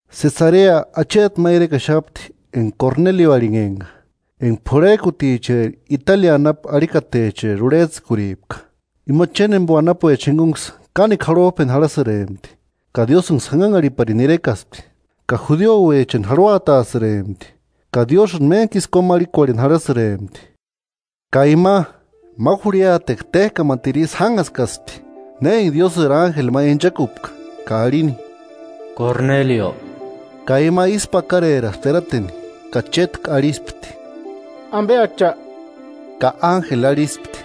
Sesarea acheti ma irekaxapti enga Kornelio arhinhempka, enga p'urhejkuticheri Italia anapu arhikatecheri urhejtsïkuripka. Ima chéni jémbo anapuecha jingunksï kánekua jarhojpeni jarhasïrempti, ka Diósïnksï janhanharhiparini irekaspti. Ka judiuechani jarhuataasïrempti ka Diósïni méntkisï kómarhikuarheni jarhasïrempti. Ka ima, ma jurhiatekua téjkamatiru ísï jánhaskaspti na enga Diósïri ánjeli ma inchakupka ka arhini: “¡Kornelio!” Ka ima ísku pakareraspti erateni ka chétku arhispti: “¿Ambe Acha?” Ka ánjeli arhispti: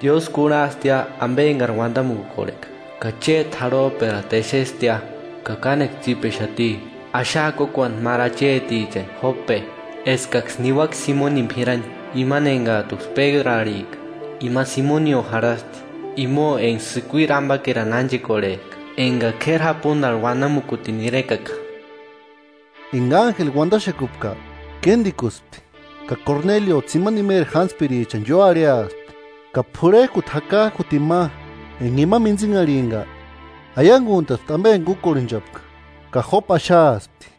“Diósï kurhastia ambe engari uandamukukorheka ka chéti jarhojperata exestia, ka kánekua tsípexati. Axaa kókuani máru achetichani Jópe, eskaksï niuaka Simonini p'irani, imani engajtuksï Pédru arhijka. Ima Simonio jarhasti, imo enga sïkuiri ambakerani ánchekorhejka enga k'éri japundarhu uanakutini irekaka.” Enga ánjeli uandaxekupka, kéndikuspti ka Kornelio tsimani imeri jántspirichani ióarhiaspti, ka p'urhejkuti jakajkutini ma enga ima mintsinharhimpka, aianguantaspti ambe enga úkorhenchapka ka Jópe axaaspti.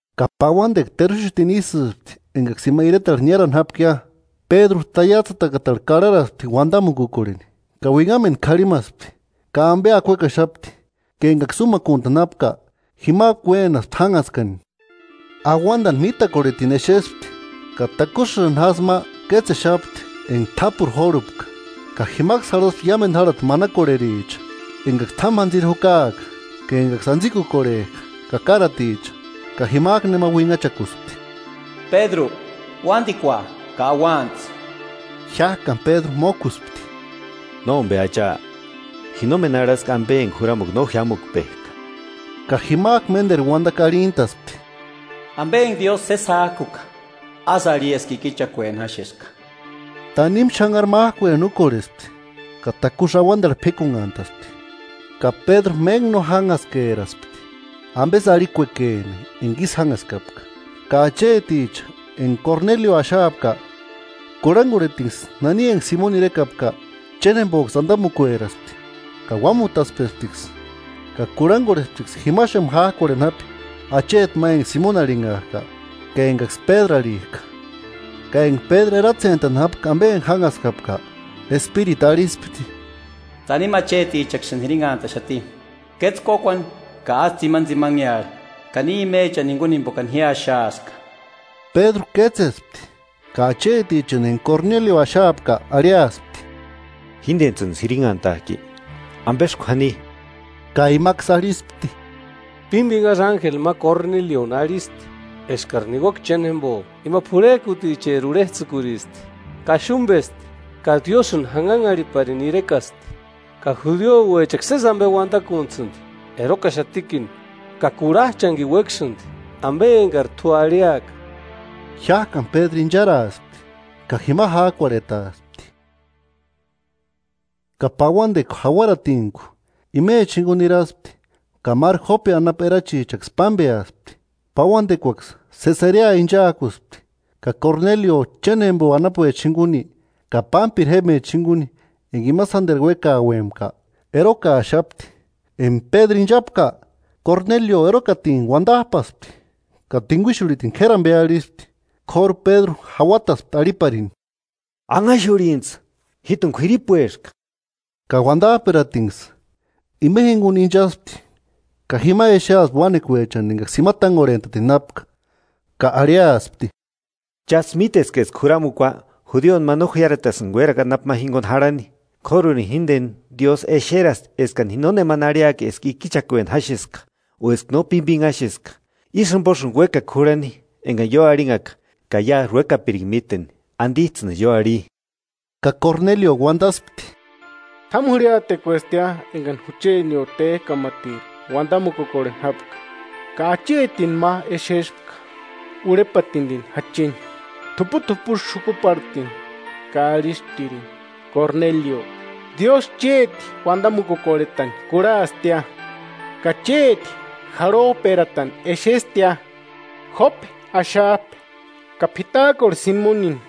Ka pauandekua teruxutini ísïspti engaksï ima iretarhu niárani jápkia, Pédru taiatsïtakatarhu karharaspti uandamukukorheni. Ka uinhamendu karhimaspti ka ambe akuekaxapti; ka engaksï úmakuntani jápka jimajku uénaspti jánhaskani: Auandani mítakorhetini exespti ka takusïni jásï ma kétsexapti enga t'ápuru jórhupka, ka jimaksï jarhaspti iámendu jarhati manakorhericha, engaksï t'ámu jantsiri jukaaka ka engaksï antsikukorhejka ka káraticha. Ka jimajku nema uinhachakuspti: “Pédru, uandikua ka auantsï.” Jiájkani Pédru mókuspti: “Nómbe Acha, ji nómeni arhaska ambe enga juramukua no jiámukpejka.” Ka jimajku ménderu uandakua arhintaspti: “Ambe enga Diósï sési jájkuka, ásï arhi eska ikichakueni jáxeska.” Tanimu xanhari májkueni úkorhespti; ka takusï auandarhu p'íkunhantaspti. Ka Pédru méntku no jánhaskeraspti ambesï arhikuekeni enga ísï jánhaskapka, ka acheticha enga Kornelio axaapka, kurhangorhetinksï nani enga Simoni irekapka, chéni jémboksï andamukueraspti. Ka uámutatspesptiksï ka kurhangorhesptiksï jimaxamu jajkuarheni japi acheti ma enga Simoni arhinhajka, ka engaksï Pédru arhijka. Ka enga Pédru eratsentani jápka ambe enga jánhaskapka, Espiritu arhispti: “Tanimu achetichaksïni jirinhantaxati. Kétse kókuani, ka ásï tsimanitsimanearha ka ni imechani jinguni, jimbokani ji axaaska”. Pédru kétsespti ka achetichani enga Kornelio axaapka arhiaspti: –¿Jíndentsïnisï jinhantajki? ¿Ambesï k'uani? Ka imaksï arhispti: –Pímbinhasï ánjeli ma Kornelioni arhisti eskari niuaka cheni jémbo, ima p'urhejkuticheri urhejtsïkuristi, kaxumbesti ka Diósïni janhanharhiparini irekasti ka judiuechaksï sési ambe uandakuntasïndi, erokaxatikini ka kurhajchanikini uékasïndi ambe engari t'u arhiaka. Jiájkani Pédru incharaaspti ka jima jájkuarhetaaspti. Ka pauandekua jauaratintku imecha jinguni niraspti ka máru Jópe anapu erachichaksï pámbeaspti. Pauandekuaksï Sesarea inchaakuspti ka Kornelio chéni jémbo anapuechani jinguni ka pámpiri jémbecha jinguni enga ima sánderu uékauempka erokaaxapti. Enga Pédru ínchapka, Kornelio erokatintku uandajpasti ka tinguixurhikutini k'éri ambe arhispti. K'óru Pédru jauataspti arhiparini: –Anhaxurhintsï, jíjtuni k'uiripueska. Ka uandajperatinksï, ima jinguni inchaspti ka jima exeaspti uánekuechani engaksï jima tángorhentatini jápka. Ka arhiaspti: –Chájtsï míteska eska juramukua, judioni ma no jiáretasïnga uérakua anapu ma jinguni jarhani, k'órurini jíndeni Diósï exerasti eskani ji nónemani arhiaka eska ikichakueni jáxeska o eska no pímbinhaxeska. Ísï jimbosïni uékaka jurhani engani ioarhinhaka. Ka iásï uékapiringa míteni, ¿Andijtsïnisï ioarhi? Ka Kornelio uandaspti: –T'ámu jurhiatekuestia engani juchenio téjkamatiru uandamukorheni jápka, ka achetini ma exeska urhepandini jacheni t'uput'upusï xukuparhatini, ka arhisptirini: Korenelio, Diósï chéti undamukukorhetani kurhastia, ka chéti jarhojperatani exestia. Jópe axajpe ka p'itajkorhe Simonini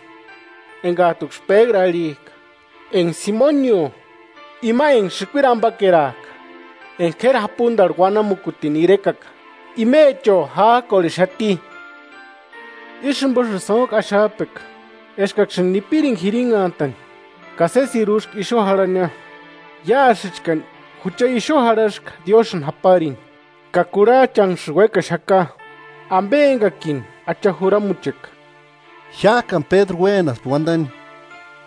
engajtuksï Pédru arhijka enga Simonio, ima enga sïkuiri ambakerajka enga k'éri japundarhu uanamukutini irekaka, imecho jájkorhexati. Ísï jimbosïni sóntku axajpeka eskaksïni nipiringa jirinhantani, ka sésiri úska ixu jarhania. Iásïchkani jucha ixu jarhaska Diósïni japarini ka kurhajchaksïni uékaxaka ambe engakini Acha juramucheka. Jiájkani Pédru uénaspti uandani: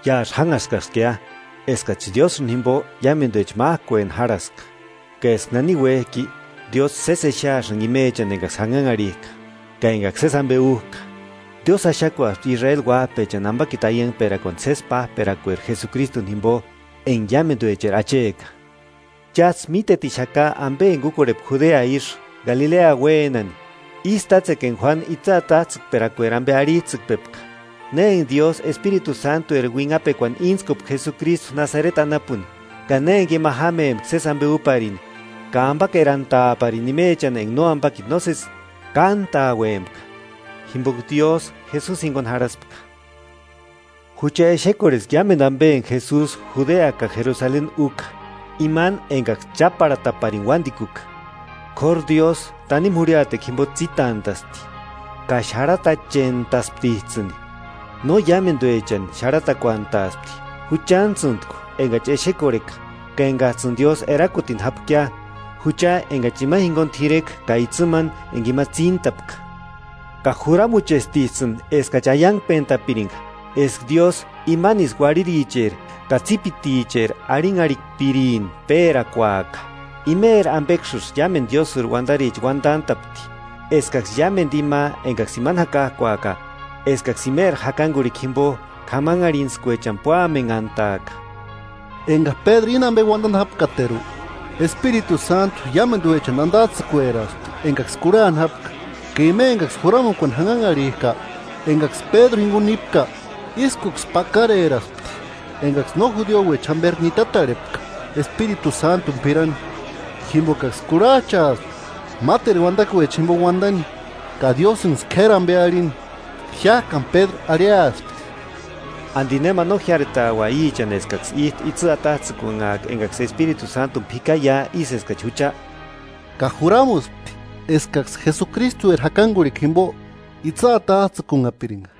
–Iásï jánhaskaskia eskachi Diósïni jimbo iámenduecha májkueni járhaska, ka eska nani uéjki Diósï sési exeasïnga imechani engaksï janhanharhijka, ka engaksï sési ambe újka. Diósï axakuaspti Israeli uájpechani, ambakiti aiangperakuani sési pájperakueri Jesukristuni jimbo, enga iámenduecheri Acheka. Chájtsï mítetixaka ambe enga úkorhepka Judea ísï, Galilea uénani ísï tátsekua enga Juánu itsï atajtsïkperakueri ambe arhijtsïkpepka: Na enga Diósï Espiritu Sántueri uinhapekuani íntskupka Jesukristu Nasareti anapuni, ka na enga ima jámempka sési ambe úparini, ka ambakerantaaparini imechani enga nóambakiti nósesi kántauempka, jimboka Diósï Jesusi jinguni jarhaspka. Jucha exekorheska iámendu ambe enga Jesusi Judea ka Jerusaleni úka, imani engaksï cháparhataparini uándikuka. K'óru Diósï tanimu jurhiatekua jimbo tsítantasti, ka xarhatachentasptijtsïni, no iámenduechani xarhakuantaaspti, juchantsïntku engachi exekorheka ka engajtsïni Diósï erakutini jápkia, jucha engachi ima jinguni t'ireka ka itsïmani enga ima tsíntapka. Ka juramuchestijtsïni eskachi aiangpentapiringa eska Diósïni imanisï uarhiricheri ka tsípiticheri arhinharhikpirini pérakuaka. Íri ambeksï iámendu Diósïri uandaricha uandantapti, eskaksï iámendu ima engaksï imani jakajkuaka, eskaksï imeri jakangurhikua jimbo k'amanharhintskuechani púamenhantaaka. Enga Pédru íni ambe uandani jápkateru, Espiritu Sántu iámenduechani andajtsïkueraspti engaksï kurhani jápka. Ka ima engaksï juramukuani janhanharhijka, engaksï Pédru jinguni nípka ískuksï pakareraspti engaksï no judiuecha jámberi nitatarhepka Espiritu Sántuni p'irani, jimbokaksï kurhajchaaspka máteru uandakuechani jimbo uandani ka Diósïnksï k'éri ambe arhini. Jiájkani Pédru arhiaspti: –¿Andi nema no jiáretaua íchani eskaksï íjtu itsï atajtsïkunhaaka engaksï Espiritu Sántuni p'ikaia ísï eskachi jucha? Ka juramuspti eskaksï Jesukristueri jakangurhikua jimbo itsï atajtsïkunhapiringa.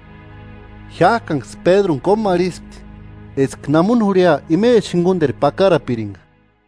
Jiájkanksï Pédruni kómarhispti eska namu jurhia imechani jingunderu pakarapiringa.